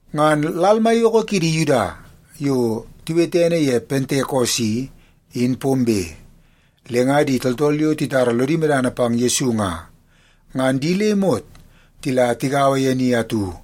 Ngan lal maiyoko kidi Yuda yo tiwete ene ye Pentekos i, in pombe. Le nga di tooltool yo titara lodi medana pang Yesu nga, ngan di le imot tila tigaua ye ni atu.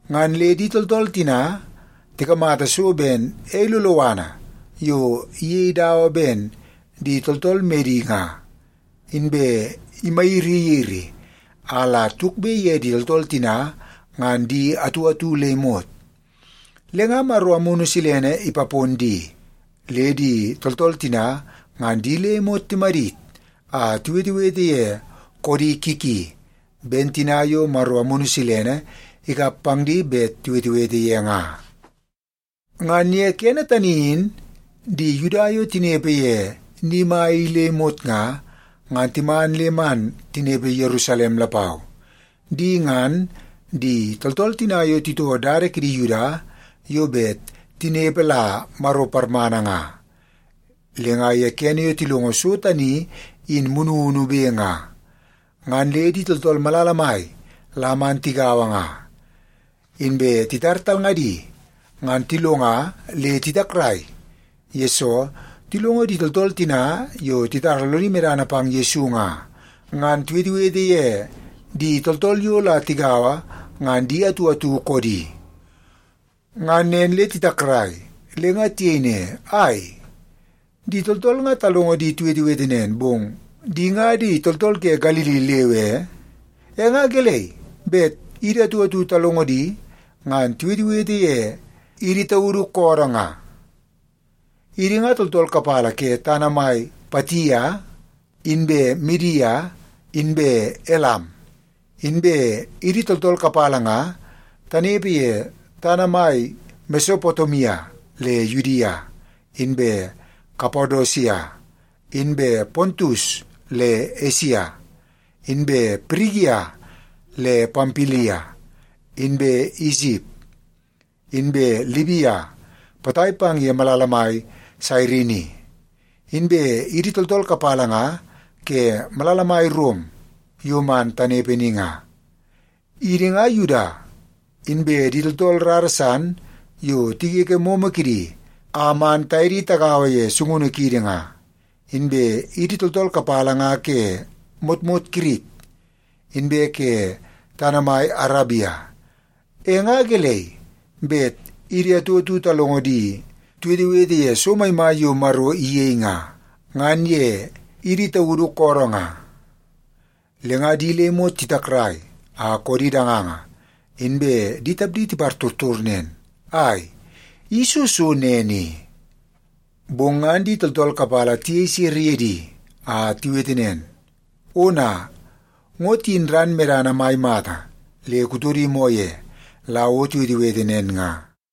Ngan le di tooltool tina tikamata so ben ei loloana yo iyei dawa ben di tooltool medi nga, inbe imayiriyiri a la tukbe ye di tooltool tina ngan di atu atu le imot. Le nga Maro Amunu Silene ipapon di, le di tooltool tina ngan di le imot timadit a tiwetewete ye koodi ki ki, ben tina yo Maro Amunu Silene ikap pang di bet tiwetewete ye nga. Ngan ye kene tani in di Yuda yo tinepe ye ni mai i le imot nga, ngan timan le man tinepe Yerusalem lapau. Di ngan, di tooltool tina yo titoo dada kidi Yuda yo bet tinepe la Maro parmana nga. Le nga ye kene yo tilongo so tani in mununube nga, ngan le di tooltool malala mai la man tigaua nga. Inbe titar talngadi, ngan tilonga le titakrai, yesoo tilongo di tooltool tina yo titara lodi medana pang Yesu nga, ngan tiwetewete ye di tooltool yo la tigaua ngan di atu atu koodi. Ngan nen le titakrai, le nga tiyei ne, “Ai, di tooltool nga talongo di tiwetewete nen, bong di nga di tooltool ke Galili leu e? E nga gelei bet idi atu atu talongo di ngan tiwetewete ye idi taudu koodoo nga? Idi nga tooltool kapala ke tana mai Patia, inbe Midia, inbe Elam. Inbe idi tooltool kapala nga tanepe ye tana mai Mesopotemia le Yudia, inbe Kapadosia, inbe Pontus le Esia, inbe Pirigia le Pampilia, inbe Isip, inbe Libia potai pang ye malala mai Sairini. Inbe idi tooltool kapala nga ke malala mai Rom yo man tanepe ni nga. Idi nga Yuda, inbe di tooltool rara san yo tigege momo kidi a man taye di tagaua ye sungunu kiidi nga. Inbe idi tooltool kapala nga ke motmot Kirit inbe ke tana mai Arabia. E nga gelei bet idi atu atu talongo di tiwetewete ye so maimai yo Maro iyei nga, ngan ye idi taudu koodoo nga?” Le nga di le imot titakrai a koodi danganga, inbe di tapdi tipartortor nen, “Ai, i soo so nen i?” Bong ngan di tooltool kapala tiyei sere ye di a tiwete nen, “Ona, ngo tiyin ran medana mai mata le kutodi moo ye la o tiwetewete nen nga.”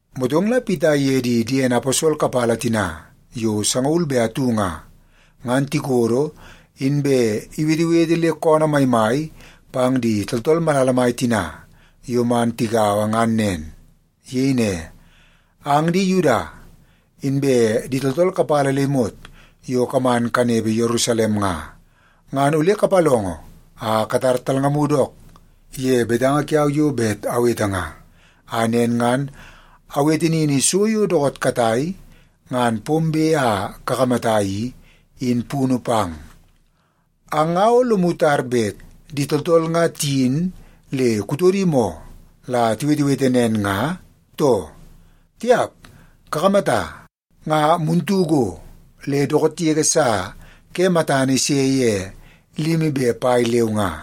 Motong la Pita iye di diene aposol kapala tina yo sangaul be atu nga, ngan tikodo, inbe iwetewete le koonoo maimai pang di tooltool malala mai tina yo man tigaua ngan nen. Iyei ne, “Ang di Yuda, inbe di tooltool kapala le imot yo kaman kanepe Yerusalem nga, ngan ole kapalongo a katar talngamu dook ye betanga kiau yo bet awete nga, a nen ngan awete nini so yo dookoot katai ngan pombe a kakamata i, in punu pang. Ang nga o lomu tar bet di tooltool nga tiyin le kutodi moo la tiwetewete nen nga, too? Tiap, kakamata, nga muntu go, le dookoot yege sa ke matana ise ye limi be pai leu nga.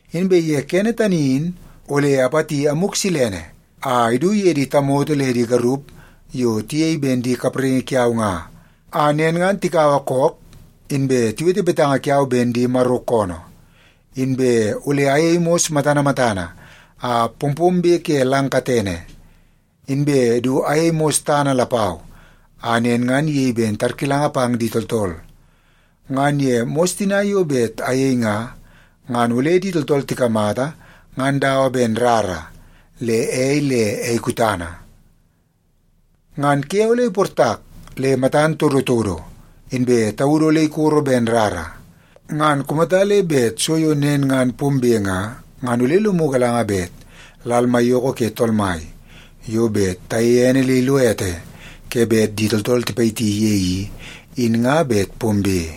Inbe ye kene tani in, ole apati Amuk Silene a idu ye di tamoto le di garup yo tiyei ben di kapraingi kiau nga, a nen ngan tikaua kook, inbe tiwete betanga kiau ben di Maro koonoo. Inbe ole ayei mos matana matana a pompombe ke lang katene, inbe du ayei mos tana lapau a nen ngan iyei ben tarkilanga pang di tooltool. Ngan ye mos tina yo bet ayei nga, ngan ole di tooltool tikamata ngan dawa ben rara, le ei, le ei kutana. Ngan ke ole iportak le matan todotodo, inbe taudu ole ikoro ben rara. Ngan kumata le bet so yo nen ngan pombe nga, ngan ole lomu galanga bet lal maiyoko ke Tool Mai yo bet tayeie ene le ilo ete ke bet di tooltool tipayiti ye i, in nga bet pombe.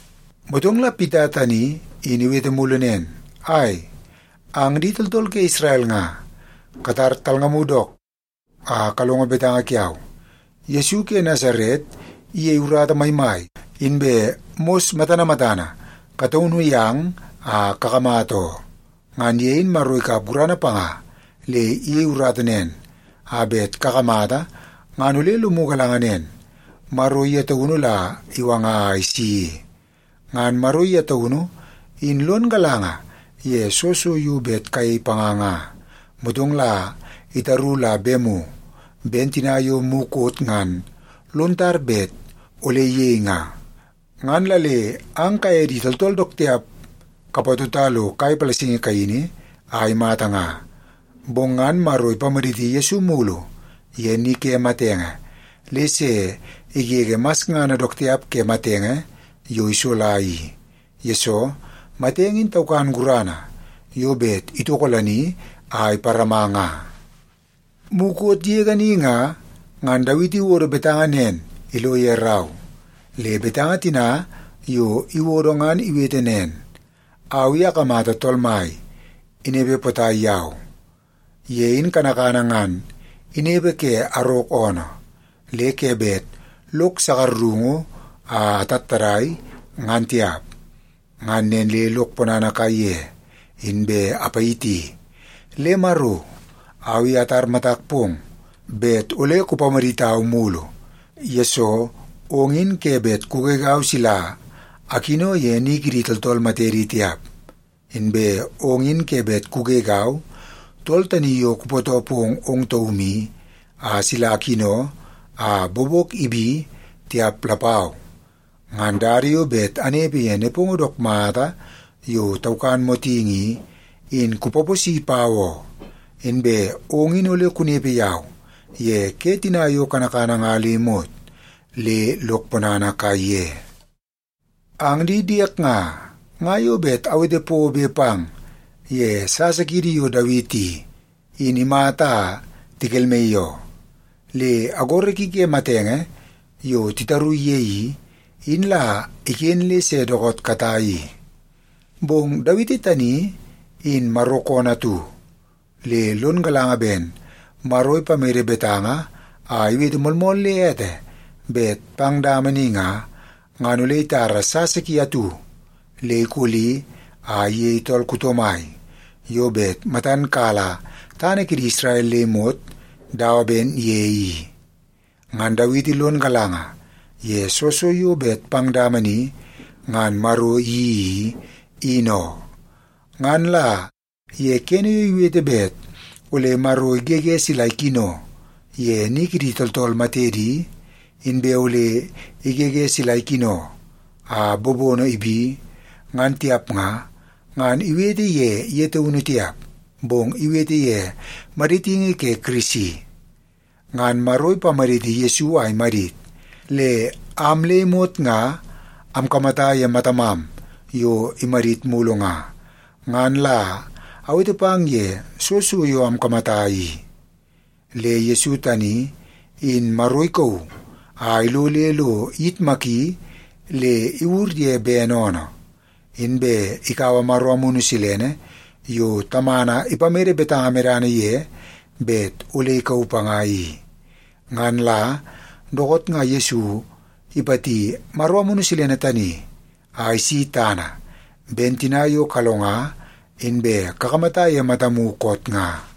Motong la Pita tani in iwete mulu nen, “Ai, ang di tooltool ke Isrel nga, katar talngamu dook a kalongo betanga kiau. Yesu ke Nasaret iyei urata maimai inbe mos matana matana kataunu yang a kakamata oo. Ngan ye in Maro ikap gurana panga le iyei urata nen a bet kakamata ngan ole lomu galanga nen, Maro ye taunu la iwanga a isi i. Ngan Maro ye taunu in lon galanga ye soo so yo bet kayei panga nga, motong la itaru la bemu, ben tina yo mukot ngan lon tar bet ole iyei nga. Ngan la le ang kaye di tooltool dook tiap kapatota lo kai palasingi kaini a imata nga. Bong ngan Maro ipamaditi Yesu mulu ye ni ke matenge, le se igege masngana dook tiap ke matenge yo isola i, yesoo matenge in taukan gurana yo bet itokolani a iparama nga. Mukot yege ni nga, ngan Dawiti iwodo betanga nen ilo ye rau. Le betanga tina yo iwodo ngan iwete nen, ‘Au i akamata Tool Mai inepe potai yau. Ye in kanakana ngan inepe ke arok oonoo, le ke bet lok sakarungu a atattadai, ngan tiap. Ngan nen le lok ponana kaiye, inbe apayiti. Le Maro, au i atar matak pong bet ole kupamaditau mulu, yesoo ong i ke bet kugegau sila akino ye ni kidi tooltool matedi tiap. Inbe ong i ke bet kugegau, Tool Tani Yo Kupootoo Pong Ong Taum I, a sila akino a bobok ibi tiap lapau. Ngan dada yo bet anepe ye nepongo dook mata yo taukan motingi i, in kupaposi pau oo. Inbe ong in ole kunepe yau ye ke tina yo kanakana nga le imot, le lok ponana kaiye.’ “Ang di diek nga, nga bet awete pobe pang ye sasa kiidi yo Dawiti i, in imata a tikelmaii oo. Le agoro ki ke matenge yo titaru ye i, in la iken le se dookoot katai i. Bong Dawiti tani in Maro koonoo atu, le lon galanga ben Maro ipamede betanga a iwete moolmool le ete bet pang dama ni nga, ngan ole itara sasa ki atu le ikoli a iyei tool kuto mai yo bet matan kala tana kidi Isrel le imot dawa ben ye i. Ngan Dawiti lon galanga ye soo so yo bet pang dama ni ngan Maro iyeii i, in oo. Ngan la ye kene yo iwete bet ole Maro igege sila ikino ye ni kidi tooltool matedi, inbe ole igege sila ikino a bobono ibi, ngan tiap nga, ngan iwete ye ye taunu tiap, bong iwete ye maditingi ke Kirisi. Ngan Maro ipamaditi Yesu a imadit, le am le imot nga amkamata ye matamam yo imadit mulu nga, ngan la awete pang ye soo so yo amkamata i. Le Yesu tani, in Maro ikauu a ilo le lo iyitmaki le iwur ye bene oonoo. Inbe ikaua Maro Amunu Silene yo Tamana ipamede betanga medana ye bet ole ikauu panga i. Ngan la dookoot nga Yesu ipati Maro Amunu Silene tani a isi tana, ben tina yo kalonga inbe kakamata ye matamu koot nga.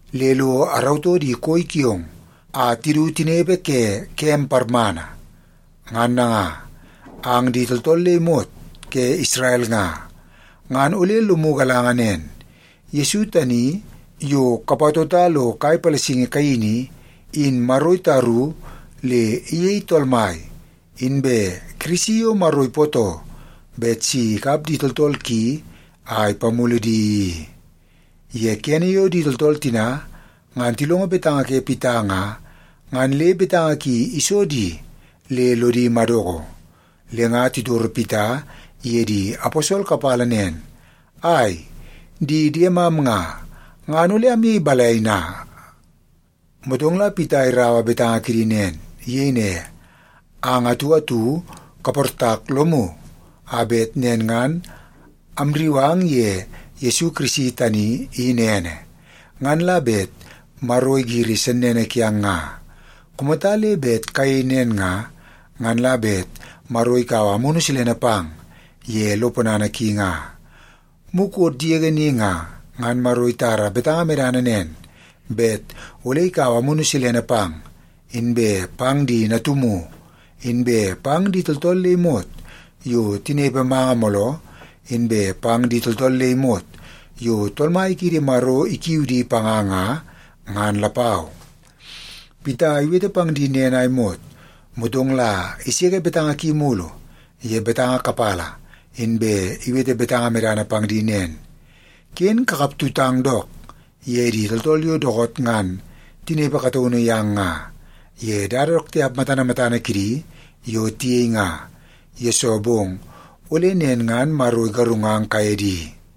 le lo arautoo di koi kiong a tidu tinepe ke kem parmana.” ’ “Ngan nanga, ang di tooltool le imot ke Isrel nga, ngan ole lomu galanga nen: Yesu tani yo kapatota lo kai palasingi kaini i, in Maro itaru le iyei Tool Mai inbe Kirisi yo Maro ipootoo bet si ikap di tooltool ki a ipamulu di i.” Ye kene yo di tooltool tina ngan tilongo betanga ke Pita nga, ngan le betanga ki iso di le lodi madoko. Le nga titoro Pita iye di aposol kapala nen, “Ai, di diemam nga, ngan ole amyei balai na?” Motong la Pita iraua betanga kidi nen. Iyei ne, “Ang atu atu kaportak lomu a bet nen ngan amrriu ang ye Yesu Kirisi tani in ene, ngan la bet Maro igiri sennene kiang nga. Kumata le bet kayei nen nga, ngan la bet Maro ikaua Amunu Silene pang ye lo ponana ki nga. Mukot yege ni nga, ngan Maro itara betanga medana nen, bet ole ikaua Amunu Silene pang, inbe pang di natumu, inbe pang di tooltool le imot yo tinepe manga mooloo, inbe pang di tooltool le imot yo Tool Mai kiidi Maro ikiu di panga nga, ngan lapau.” Pita iwete pang di nen a imot, motong la iseke betanga ki mulu ye betanga kapala, inbe iwete betanga medana pang di nen, “Ken kakap tutang dook ye di tooltool yo dookoot ngan tinepe kataunu yang nga, ye dada dook tiap matana matana kidi yo tiyei nga, yesoo bong ole nen ngan Maro igarungang kaye di.”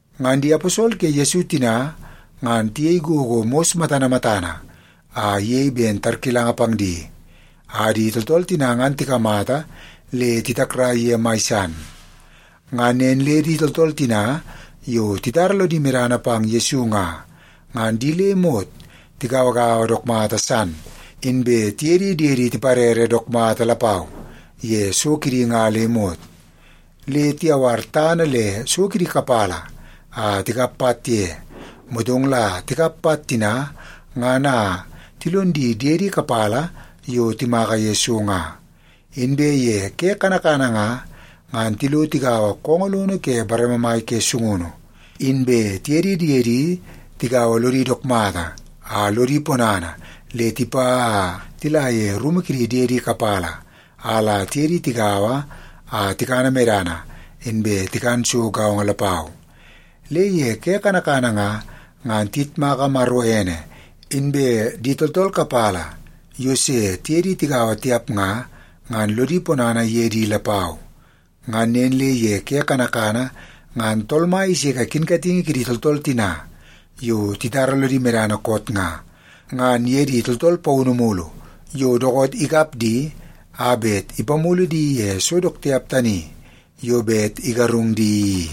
Ngan di aposol ke Yesu tina ngan tiyei gogo mos matana matana a iyei ben tarkilanga pang di, a di tooltool tina ngan tikamata le titakrai ye mai san. Ngan nen le di tooltool tina yo titara lodi medana pang Yesu nga, ngan di le imot tigauagaua dook mata san, inbe tiye di diedi tiparere dook mata lapau ye so kidi nga le imot. Le tiyawar tana le so kidi kapala a tikap pat ye, motong la tikap pat tina ngan a tilon di diede kapala yo timaka ye so nga. Inbe ye ke kanakana nga, ngan tilo tigaua koongoo lono ke bareme mai ke sungunu. Inbe tiye di diedi tigaua lodi dook mata a lodi ponana le tipa a tila ye rumu kidi diedi kapala a la tiye di tigaua a tikana medana, inbe tikan so gaongo lapau. Le ye ke kanakana nga, ngan tiyitmaka Maro ene, inbe di tooltool kapala yo se tiye di tigaua tiap nga, ngan lodi ponana ye di lapau. Ngan nen le ye ke kanakana ngan Tool Mai iseke kinkatingi kidi tooltool tina yo titara lodi medana koot nga, ngan ye di tooltool paunu mulu yo dookoot ikap di a bet ipamulu di ye so dook tiap tani yo bet igarung di i.